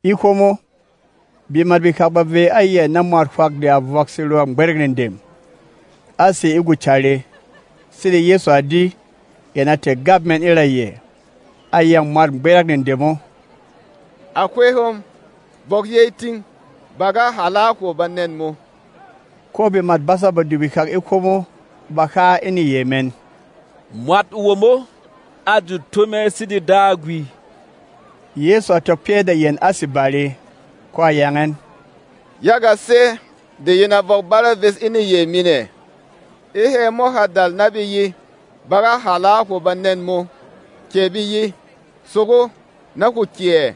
E hwomo, bemat behak ba vey a yɛ na mwat hwak de a vɔk serɔ̂ gbɛrɛ̂k nedem, a sé e gwocàre. Sede Yɛsu a di, yɛn a tɛ̀ gap mɛn e ra yɛ, a yâng mwât gbɛrɛ̂k nedem o, “À hwey hom, vɔk yey ting! Ba ga hàla a hwo banɛn mō.” Ko bemât basâ Badu behak e hwomo ba ha e neyey mɛn, “Mwat womo a jut tó mɛ sede Dagwi!” Yɛsu a tɔk pyɛ́ de yɛn a sé bare, ko a yang ɛn, “Yaga sɛ́ de yin a vɔk bare ves e neyey min ɛ? E hɛ̌ mo ha dal na be ye, ‘Ba ga hàla a hwo banɛn mō’, kɛ be ye, ‘Sogo, na hwo kyè!’ ɛ?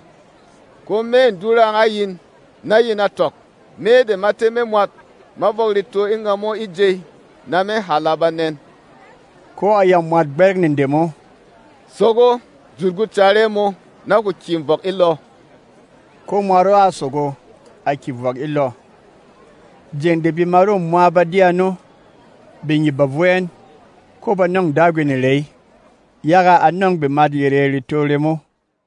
Ko mê dura a yin, na yin tɔk, Me de ma tɛ́ me mwat ma vɔk reto e ngamo e jey na me hàla banɛn.” Ko a yâng mwât gbɛrɛ̂k nedem o, “Sogo, jut gwocàre mō, na hwo kyè vɔk e lɔ.” Ko mwat o a sogo, a kyè vɔk e lɔ. Jeng de bemat o mwa ba di ano, bengyip ba vo ɛn, ko ba nɔ̂ng Dagwi nerey, yaga a nɔ̂ng bemat yerê reto remo.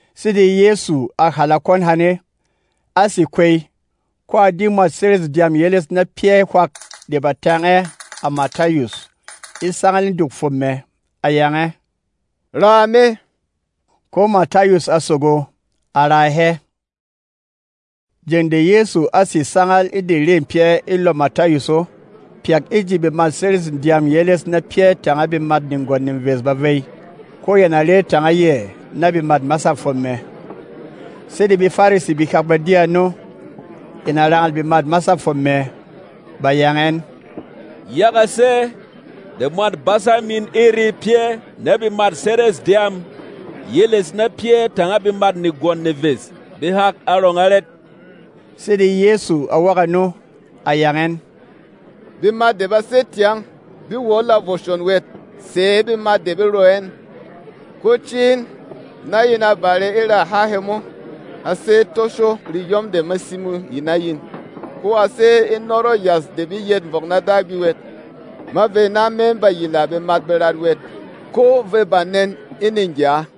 Sede Yɛsu a hàla kwɔn hane, a sé kwey, ko a di mwât serês dyâm yeles na pyɛ́ hwak de ba tang ɛ, à Matayus e sangal e duk fwom mɛ. A yang ɛ, “Raa me.” Ko Matayus a sogo, a raa hɛ. Jeng de Yɛsu á sè sangal e de rê pyɛ́ e lɔ Matayus o, pyak e ji bemât serês dyâm yeles na pyɛ́ tanga bemât negwɔn neves ba vey, ko yɛn a re tanga yɛ na bemât masâ fwom mɛ. Sede BeFarisi behak ba di ano, yɛn a rangal bemât masâ fwom mɛ, ba yang ɛn, “Yaga sɛ́ de mwât basa min e re pyɛ́ na bemât serês dyâm yeles na pyɛ́ tanga bemât negwɔn neves behak arɔng arɛt?” Sede Yɛsu a wok ano, a yang ɛn, “Bemat de ba sé tyang be wɔ e lɔ vwoshon wɛt sɛ̌ bemat de be ro ɛn. Ko cī in, na yin a bare e ra há hemo, ‘A sé e toshô reyɔm de me simo yi na yin, ko a sé e nɔrɔ̂ yas de be yɛt vɔk na Dagwi wɛt.’ Ma vey na me ba yila bemat berat wɛt ko vê banɛn e negya.”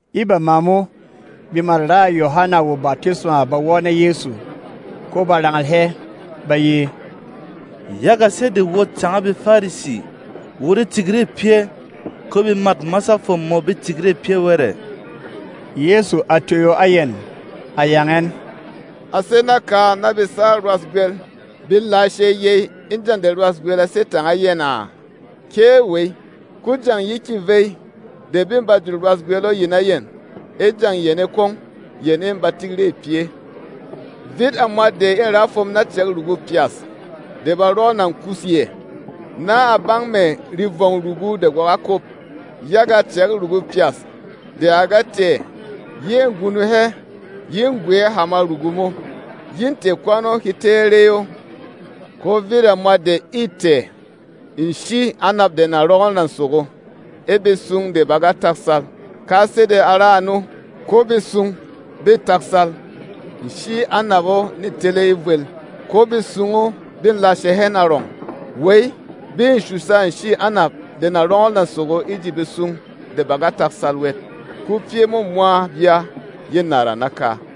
E bama mo, bemât raà Yohana wo batisma ba wɔ́ na Yɛsu, ko ba rangal hɛ, ba ye, “Yaga sɛ́ de wot tanga BeFarisi wot e tik rê pyɛ́, ko bemât masâ fwom mō be tik rê pyɛ́ wɛt ɛ?” Yɛsu a toyo a yɛn, a yang ɛn, “A sé naka na besâ rwâs gwel be lashe yey e jeng de rwâs gwel a sé tanga yɛn a? Kée wey! Ko jeng ye kyè vey de bê ba jut rwâs gwel o yi na yɛn. E jeng yane kwong, yɛn ê ba tik rê pyɛ́. “Vit a mwat de ê ra fwom na cɛ̌k rugu pyas de ba rɔɔ nà kus yɛ, na a bang mɛ̀ revɔng rugu de gwa ga kwop. Yaga cɛ̌k rugu pyas de a ga tɛ̀ yê gunung hɛ, yê gwɛ̌ hama rugu mo, yê tɛ̀ kwɔn o he tɛ́ ɛ rey o. Ko vit a mwat de ê tɛ̀ nshî anap de na rɔngɔl nà sogo e betsung de ba ga taksal. Ka sede a ra ano, ko betsung bê taksal nshî anap o nê tele e vwel, ko betsung o bê lashe hɛn arɔng. Wey, bé shusha nshî anap de na rɔngɔl nà sogo e ji betsung de ba ga taksal wɛt, ko pyɛ́ mo mwa bya yê nàra naka.”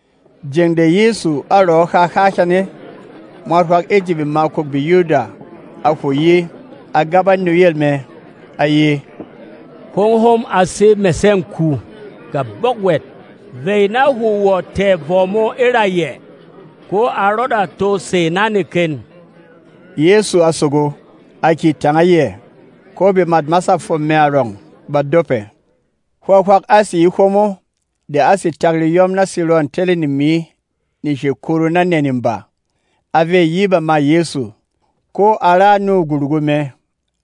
Jeng de Yɛsu a rɔɔ ha há hane, mwat hwak e ji bemakûk BeYuda a hwo yi, a gaba e nuyel mɛ, a ye, “Hwóng hom a sé mɛsɛ̂ng ku. Gabɔk wɛt, vey na hwo wɔ̀ tɛ̀ vɔ mō e ra yɛ, ko a rɔda to sè na neken.” Yɛsu a sogo, a kyè tanga yɛ, ko bemât masâ fwom mɛ arɔng ba dopɛ. Hwā hwak á sè e hwomo de á sè tak reyɔm na serɔ̂ telê nemi neshey kuru na nɛ neba. A vey yi e bamâ Yɛsu, ko a ra nû gworugu mɛ.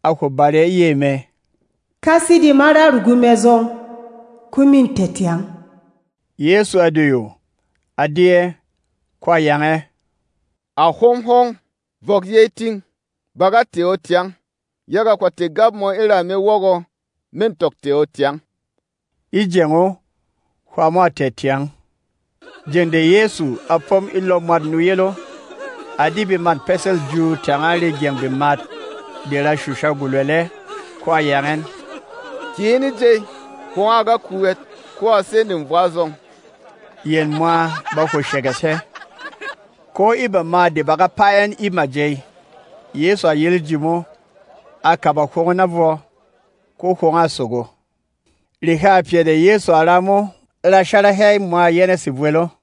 A hwo bare e yey mɛ, “Ka sede ma ra rugu mɛ zɔng, ko mê tɛ̀ tyang.” Yɛsu a doyo, a di ɛ, ko a yang ɛ, “À hwóng hom, vɔk yey ting! Ba ga tɛ̀ o tyang, yaga hwà tɛ̀ gap mō e ra me wɔgɔ, mê tɔk tɛ̀ o tyang.” E jeng o, hwā mo a tɛ̀ tyang. Jeng de Yɛsu a pom e lɔ mwât nuyel o, a di bemât pɛsɛ̂l jū tanga regyɛng bemat de ra shusha gwolwɛlɛ, ko a yang ɛn, “Kyè in e jey! Hwōng o a ga ku wɛt, ko a sê nevwa zɔng!” Yɛn mwa ba hwo shɛgɛsh hɛ. Ko e bama de ba ga paa ɛn e majey, Yɛsu a yel e ji mo, a kaba hwong o na vwɔ, ko hwong o a sogo. Rehâ pyɛ de Yɛsu a ra mo ra shara hɛ e mwa yɛnɛ̂ sevwel o.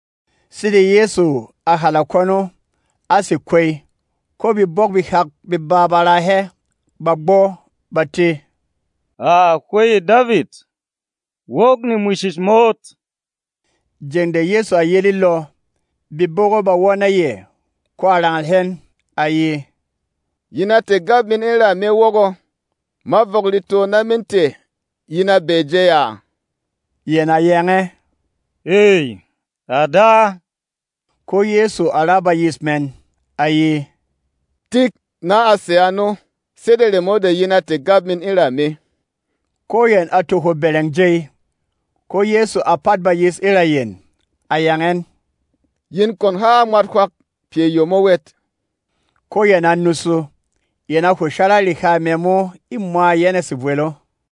Sede Yɛsu a hàla kwɔn o, a sé kwey, ko bebók behak beba ba raa hɛ, ba gbɔ, ba tē, “À Hwey Davit, wok nemwishish mot!” Jeng de Yɛsu a yel e lɔ, bebók o ba wɔ́ na yɛ, ko a rangal hɛn, a ye, “Yin a tɛ̀ gap min e ra me wɔgɔ, ma vɔk reto na me tɛ̀, yin a bɛɛ jey a?” Yɛn a yang ɛ, “Ey, à Da!” Ko Yɛsu a ra bayis mɛn, a ye, “Tik na a sè ano, sede remo de yin a tɛ̀ gap min e ra me.” Ko yɛn a to hwo bɛrɛng jey. Ko Yɛsu a pat bayis e ra yɛn, a yang ɛn, “Yin kwon ha a mwat hwak pyɛ yemo wɛt!” Ko yɛn a nusu, yɛn a hwo shara reha mɛ mo e mwa yɛnɛ̂ sevwel o.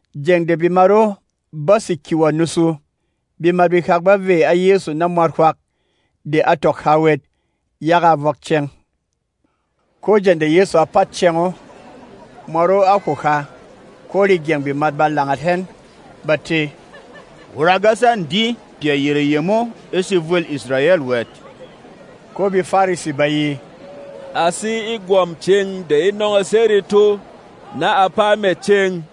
Jeng de bemat o bá sè kyè wɔ̀ nusu, bemat behak ba vey a Yɛsu na mwat hwak de a tɔk ha wɛt, yaga a vɔk ceng. Ko jeng de Yɛsu a pat ceng o, mwat o a hwo ha, ko regyɛng bemat ba langat hɛn, ba tē, “Wot a ga sang di pyɛ yerê yemo e sevwêl Israyɛl wɛt.” Ko BeFarisi ba ye, “A sé e gwɔ̀m cēng de e nɔngɔs hɛ reto na a paa mɛ̀ cēng!”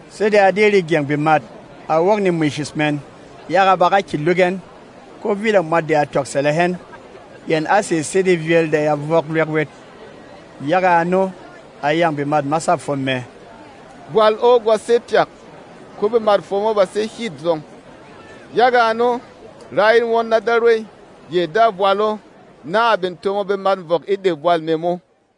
Sede a di regyɛng bemat, a wok nemwishish mɛn, yaga ba ga kyě luk ɛn, ko vit a mwat de a tɔk sɛlɛ hɛn; yɛn á sè sede vyēl de ya vɔk lwek wɛt. Yaga ano, a yâng bemât masâ fwom mɛ, “Bwal o gwa sé pyak, ko bemât fwom o ba sé hyet zɔng. Yaga ano, rá in won na Darwey, yɛ dâ bwal o, na a bin tomo bemat vɔk e de bwal mɛ mo.”